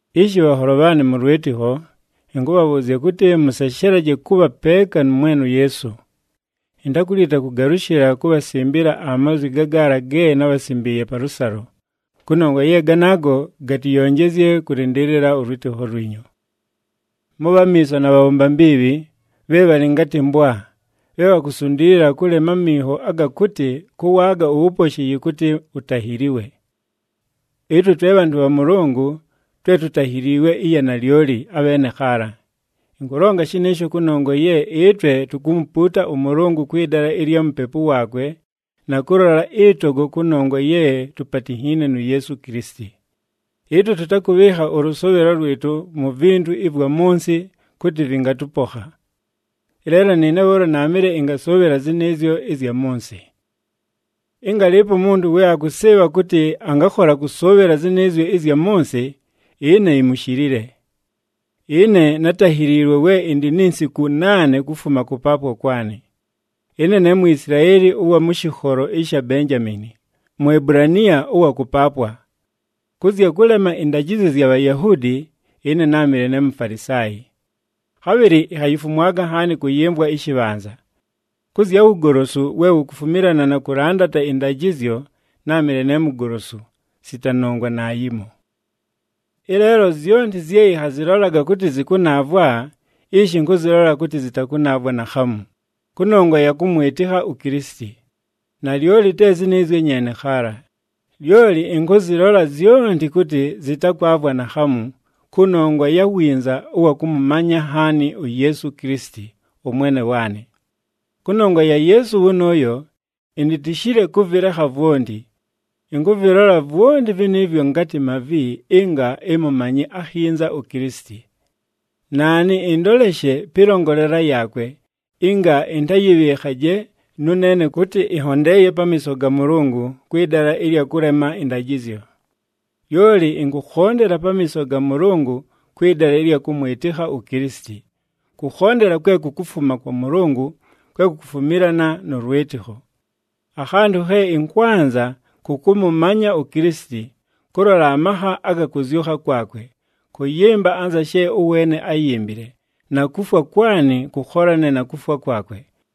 Ishi bhanholo bhaanɨ mʉ lwɨtɨkho, ɨnkʉbhabhʉʉzya kʉtɨ, mʉseshelaje kʉbha peeka nʉ Mwene uYeesu. Intakulita kʉgalʉshɨla kubhasimbila amazwi gagaala ge nábhasimbiiye palʉsalo, kʉnongwa ye ganaago gatɨyonjezye kʉlɨndɨɨlɨla ʉlwɨtɨkho lwinyu. Mʉbhe amiiso na bhabhomba mbiibhi, bhe bhalɨ ngatɨ mbwa, bhe bhakusundiilila kʉlema aminho aga kʉtɨ kʉwaaga uwuposhi yɨkʉtɨ utahiiliwe. Ɨtwe twe bhantʉ bha Mʉlʉngʉ twe tutahiliilwe ɨya nalyoli, abheene khaala. Ɨnkʉlonga shɨnɨɨsho kʉnongwa ye ɨtwe tukumupuuta ʉMʉlʉngʉ kwɨ dala ɨlya Mupepu waakwe na kʉlola ɨtogo kʉnongwa ye tupatinhiine nu Yeesu Kilisiti. Ɨtwe tʉtakʉbhɨɨkha ʉlʉsʉʉbhɨlo lwɨtʉ mu vintu ɨvwa mʉ nsɨ kʉtɨ vɨngatʉpokha. Ɨleelo nɨɨne bhʉʉlo naamɨle ɨngasʉʉbhɨla zɨnɨɨzyo ɨzya mʉ nsɨ. Ɨnga alɨɨpo umuntu we akʉsɨɨbha kʉtɨ angakhola kʉsʉʉbhɨla zɨnɨɨzyo ɨzya mʉ nsɨ, ɨne imushilile. Ɨne nátahiliilwe we ɨndɨ ni nsiku naane kufuma kʉpaapwa kwanɨ. Ɨne ne Mwisilaeli ʉwa mʉ shɨkholo sha Benjamiini, Muebulaniya ʉwa kʉpaapwa. Kʉ zya kʉlema ɨndajɨzyo zya Bhayahuudi, ɨne náamɨle ne Mufalisaayi. Khabhɨlɨ inhayifumwaga nhaani kʉyɨmvwa ɨshɨbhanza. Kʉ zya wugolosu we wukufumilana na kʉlandata ɨndajɨzyo, náamɨle ne mugolosu, sita nongwa naayimo. Ɨleelo zyonti zye ɨnhazɨlolaga kʉtɨ zɨkʉnaavwa, ishi ɨnkʉzɨlola kʉtɨ zɨtakʉnaavwa naakhamu, kʉnongwa ɨya kʉmwɨtɨkha uKilisiti. Nalyoli te zɨnɨɨzyo nyeene khaala, lyoli ɨnkʉzɨlola zyonti kʉtɨ zɨtakwavwa naakhamu, kʉnongwa ya winza ʉwa kʉmʉmanya nhaani uYeesu Kilisiti, ʉMwene waanɨ. Kʉnongwa ya Yeesu wʉnʉʉyo, initishile kʉvɨlekha vwonti. Ɨnkʉvɨlola vwonti vɨnɨɨvwo ngatɨ mavi ɨnga ɨmʉmanye akhinza uKilisiti. Naanɨ ɨndoleshe pɨlongolela yaakwe, ɨnga ɨntayɨbhɨɨkhaje nʉneene kʉtɨ ɨnhondeeye pamiiso ga Mʉlʉngʉ kwɨ dala ɨlya kʉlema ɨndajɨzyo. Lyoli ɨnkʉkhondela pamiiso ga Mʉlʉngʉ kwɨ dala ɨlya kʉmwɨtɨkha uKilisiti, kʉkhondela kwe kukufuma kwa Mʉlʉngʉ, kwe kukufumilana nʉ lwɨtɨkho. Akhantʉ khe ɨnkwanza, kʉ kʉmʉmanya uKilisiti, kʉlola amakha aga kʉzyʉkha kwakwe, kʉyɨmba anza she ʉweene áyimbile, na kufwa kwanɨ kʉkholane na kufwa kwakwe.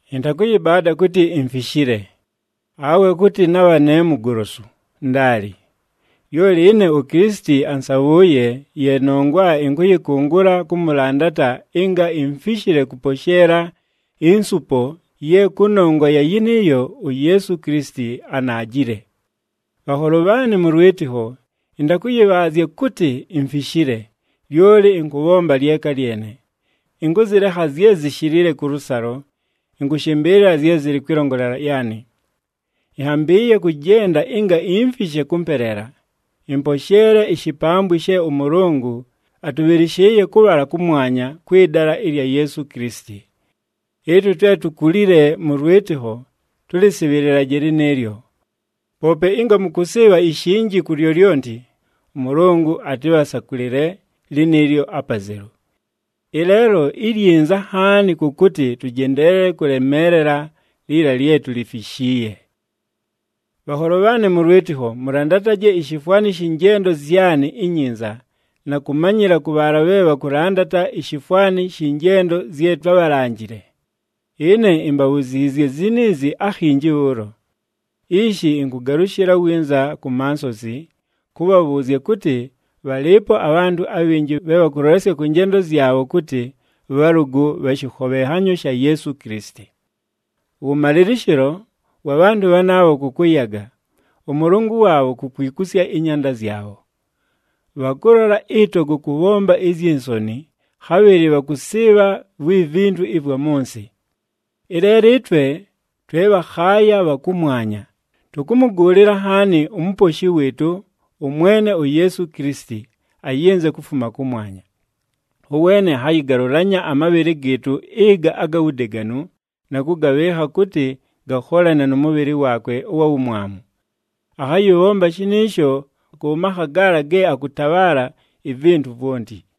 Ɨntakʉyɨbaada kʉtɨ imfishile, awe kʉtɨ nabha ne mugolosu, ndaali. Lyoli ɨne uKilisiti ansabhʉʉye, ye nongwa ɨnkʉyɨkʉngʉla kʉmʉlandata ɨnga imfishile kʉposheela insupo ye kʉnongwa ya yɨnɨɨyo uYeesu Kilisiti anaajile. Bhanholo bhaanɨ mʉ lwɨtɨkho, ɨntakʉyɨbhaazya kʉtɨ imfishile, lyoli ɨnkʉbhomba lyeka lyene, ɨnkʉzɨlekha zye zishilile kʉlʉsalo, ɨnkʉshɨmbɨɨlɨla zye zɨlɨ kwɨlongolela yaanɨ. Ɨnhambɨɨye kʉjenda ɨnga imfishe kʉmpeleela, ɨmposheele ishipambwi she ʉMʉlʉngʉ atʉbhɨlɨshɨɨye kʉbhala kʉmwanya kwɨ dala ɨlya Yeesu Kilisiti. Ɨtwe twe tukulile mʉ lwɨtɨkho, tʉlɨsɨbhɨlɨlaje lɨnɨɨlyo. Poope ɨnga mʉkʉsɨɨbha ishinji ku lyolyonti, ʉMʉlʉngʉ atɨbhasakʉlɨle lɨnɨɨlyo apazelu. Ɨleelo ilyinza nhaani kʉ kʉtɨ tʉjendeelele kʉlemeelela liila lye tulifishiiye. Bhanholo bhaanɨ mʉ lwɨtɨkho, mʉlandataje ishifwani shɨ njendo zyanɨ inyinza na kʉmanyɨla kʉ bhaala bhe bhakʉlandata ishifwani shɨ njendo zye twábhalanjile. Ɨne imbabhuziizye ziniizi akhinji bhʉʉlo. Ishi ɨnkʉgalʉshɨla winza ku mansozi, kʉbhabhʉʉzya kʉtɨ bhalɨɨpo abhantʉ abhinji bhe bhakʉlolesya kʉ njendo zyabho kʉtɨ bhalʉgʉ bha shɨkhobhenhanyo sha Yeesu Kilisiti. Ʉwʉmalɨlɨshɨlo wa bhantʉ bhanaabho kʉ kʉyaga, ʉmʉlʉngʉ waabho ku kwikusya ɨnyanda zyabho. Bhakʉlola ɨtogo kʉbhomba izyi nsoni, khabhɨlɨ bhakʉsɨɨbha vwi vintu ɨvwa mʉ nsɨ. Ɨleelo ɨtwe twe bhakhaaya bha kʉmwanya, tʉkʉmʉgʉʉlɨla nhaani uMuposhi wɨɨtʉ, ʉMwene uYeesu Kilisiti, ayɨnze kufuma kʉmwanya. Ʉweene akhayɨgalʉlanya amabhɨlɨ gɨɨtʉ ɨga aga wudeganu, na kʉgabhɨɨkha kʉtɨ gakholane nʉ mʉbhɨlɨ waakwe ʉwa wumwamu. Akhayɨbhomba shɨnɨɨsho kʉ makha gaala ge akʉtabhaala ivintu vwonti.